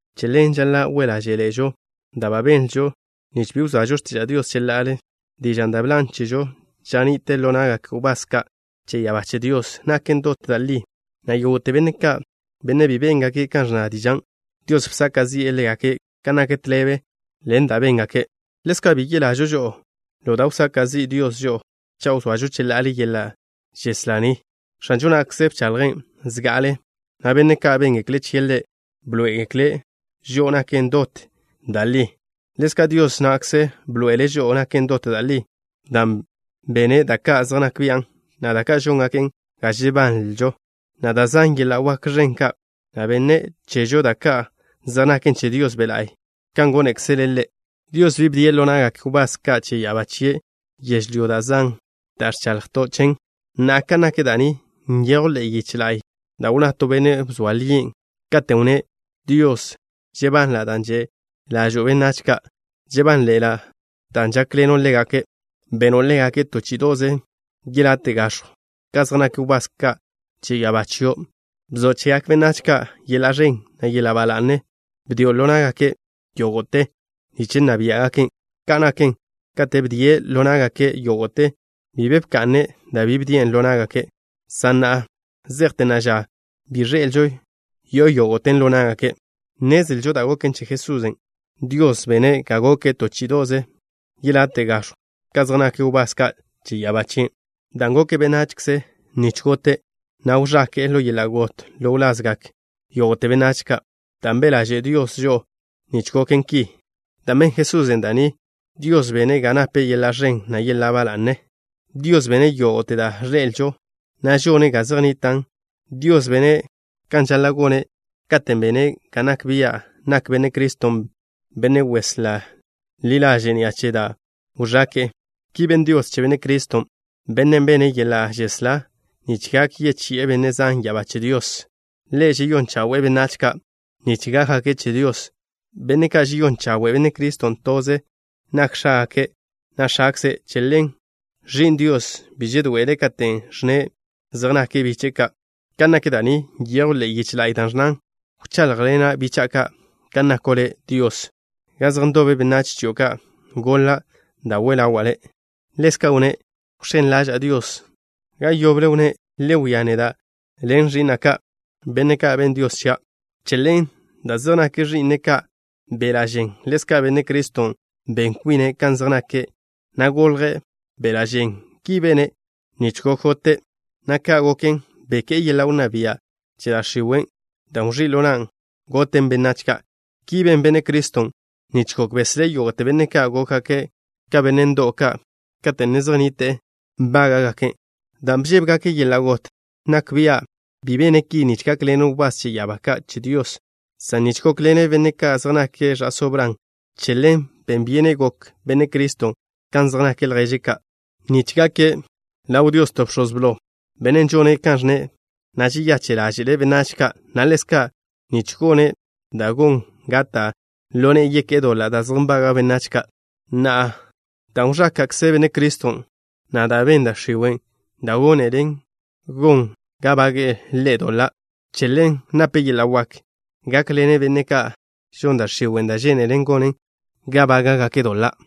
Che ḻen, žaḻa' we' ḻáže'ḻe'ežo da' ba benlžo, nich bi wzoažo x̱tiža' Dios cheḻa'ale. Dižan' da' bžinen chežo ža ni'te ḻo na'gak wbás ka' che ya'abá che Dios, naken dot da' li, na' yógo'te benne' ka', benne' bi béngake' kan ẕnna dižan', Dios bsaka' zi'e ḻégake' kan nak tḻebe ḻen da' béngake'. Ḻezka' bi yelažo žo'o ḻo da' wsaka' zi' Dios žo'o cha' wzoažo cheḻa'ale yeḻa' žeslá ni. X̱anžo na'kze bchaḻjen' zga'ale, na' benne' ka' béngekle' chie' Ḻe' bḻoé'egekle' žo'o naken dot da' li. Ḻezka' Dios na'kze bḻoe'ele' žo'o naken dot da' li, dan' bene' da' ka' zej nak bian', na' da' ka' žóngaken ga žebanlžo, na' da' zan yeḻa' wak ẕen ka', na' benne' chežo da' ka' zej naken che Dios Be' La'y kan gónekzele' Ḻe'. Dios bi bdie' ḻo na'gak wbás ka' che ya'abá chie' yežlyó da' zan', dan' ẕchaḻjto' chen. Na'a, kan nak da' ni, nyejw ḻe'e yiche la'y da' wnná to benne' bzoa lien', katen' wnné': Dios, žebanla' dan' že' ḻažo'o benách ka'. Žebánḻe'ela' dan' žákḻeno' ḻégake'. Beno' ḻégake' to chí'ido'ze yelate' gax̱jw ka zej nak wbás ka' che ya'abá chio'. Bzo' chegak benách ka' yeḻa' ẕen, na' yeḻa' ba la'ne. Bdio' ḻo ná'gake' yógo'te nich nna biá'gaken'. Ka' naken, katen' bdie' ḻo ná'gake' yógo'te, bi be bka'ne' da' bi bdien' ḻo ná'gake', san na' zejte na'a ža, bi ẕḻe'elžo yo'o yógo'ten ḻo ná'gake'. Nnezlžo da' goken che Jesusen'. Dios bene' ga goke' to chí'ido'ze yelate' gax̱jw ka zej nak wbás ka' che ya'abá chien', dan' goke' benachze nich gote', na' wẕake'e ḻo yeḻa' got ḻo wlazgak yógo'te benách ka', dan' be' ḻaže' Dios žo'o nich goken ki. Dan' ben Jesusen' da' ni, Dios bene' ga nape' yeḻa' ẕen, na' yeḻa' ba la'ne. Dios bene' yógo'te da' ẕḻe'elžo, na' žone' ga zej nnitan'. Dios bene' kan žaḻa' gone' katen' bene' ga nak bia' nak Benne' Criston' Benne' Weslá ḻi ḻaže' ni'a che da' wẕake'e. Ki ben Dios che Benne' Criston', Bennen' bene' yeḻa' žeslá nich gak yechi'e benne' zan ya'abá che Dios. Ḻe' žeyón chawe'e benách ka' nich gákgake' che Dios. Benne' ka' žeyón chawe' Benne' Criston', toze nak X̱ágake', na' X̱akze'. Che ḻen, Ẕi'n Dios bi žedoe'ele' katen' ẕnne' zej nake' biche'e ka'. Ka nak da' ni nyejw ḻe'e yiche la'y, da' ẕnnan: Wcháḻjḻena' bicha'a ka' kan nako' Le', Dios. Ga zej ndobe benách chio' ka' goḻa' da' we ḻawa' Le'. Ḻezka' wnné': Wx̱én ḻaža'a Dios. Ga yoble wnné': Le wia neda' ḻen ẕi'na' ka', Benne' ka' benn Dios chia'. Che ḻen, dan' zej nak ẕi'ne' ka' beḻa' žen, ḻezka' Benne' Criston' ben kwine' kan zej nake', na' golje' beḻa' žen. Ki bene' nich gok gote', na' ka' goken beké'e yeḻa' wnná bia' che da' x̱iwe', dan' wẕí' ḻo nan' goten benách ka'. Ki ben Benne' Criston' nich gok beslé' yógo'te benne' ka' gókgake' ka benne' ndo'w ka' kate' ne zej nnite'e nbángake', dan' bžébegake' yeḻa' got. Nak bia' bi bene' ki nich gákḻene' wbás che ya'abá ka' che Dios, san nich gókḻene' benne' ka' zej nake' ẕa'só Bran. Che ḻen, ben byenen gok Benne' Criston' kan zej nak lježe' ka', nich gake' ḻaw Dios to bx̱oz blo, benne' žone' kan ẕnne', na' žeyache' ḻáže'le' benách ka', na' ḻezka' nich gone' da' gon ga gata' ḻo ne'e yeké'e doḻa' da' zej nbaga' benách ka'. Na'a, dan' wẕáka'kze Benne' Criston', na' dan' ben da' x̱iwe' da' gónelen gon ga bage'e Ḻe' doḻa', che ḻen nape' yeḻa' wak gákḻene' benne' ka', žon da' x̱iwe' da' žénelen gonen ga bága'gake' doḻa'.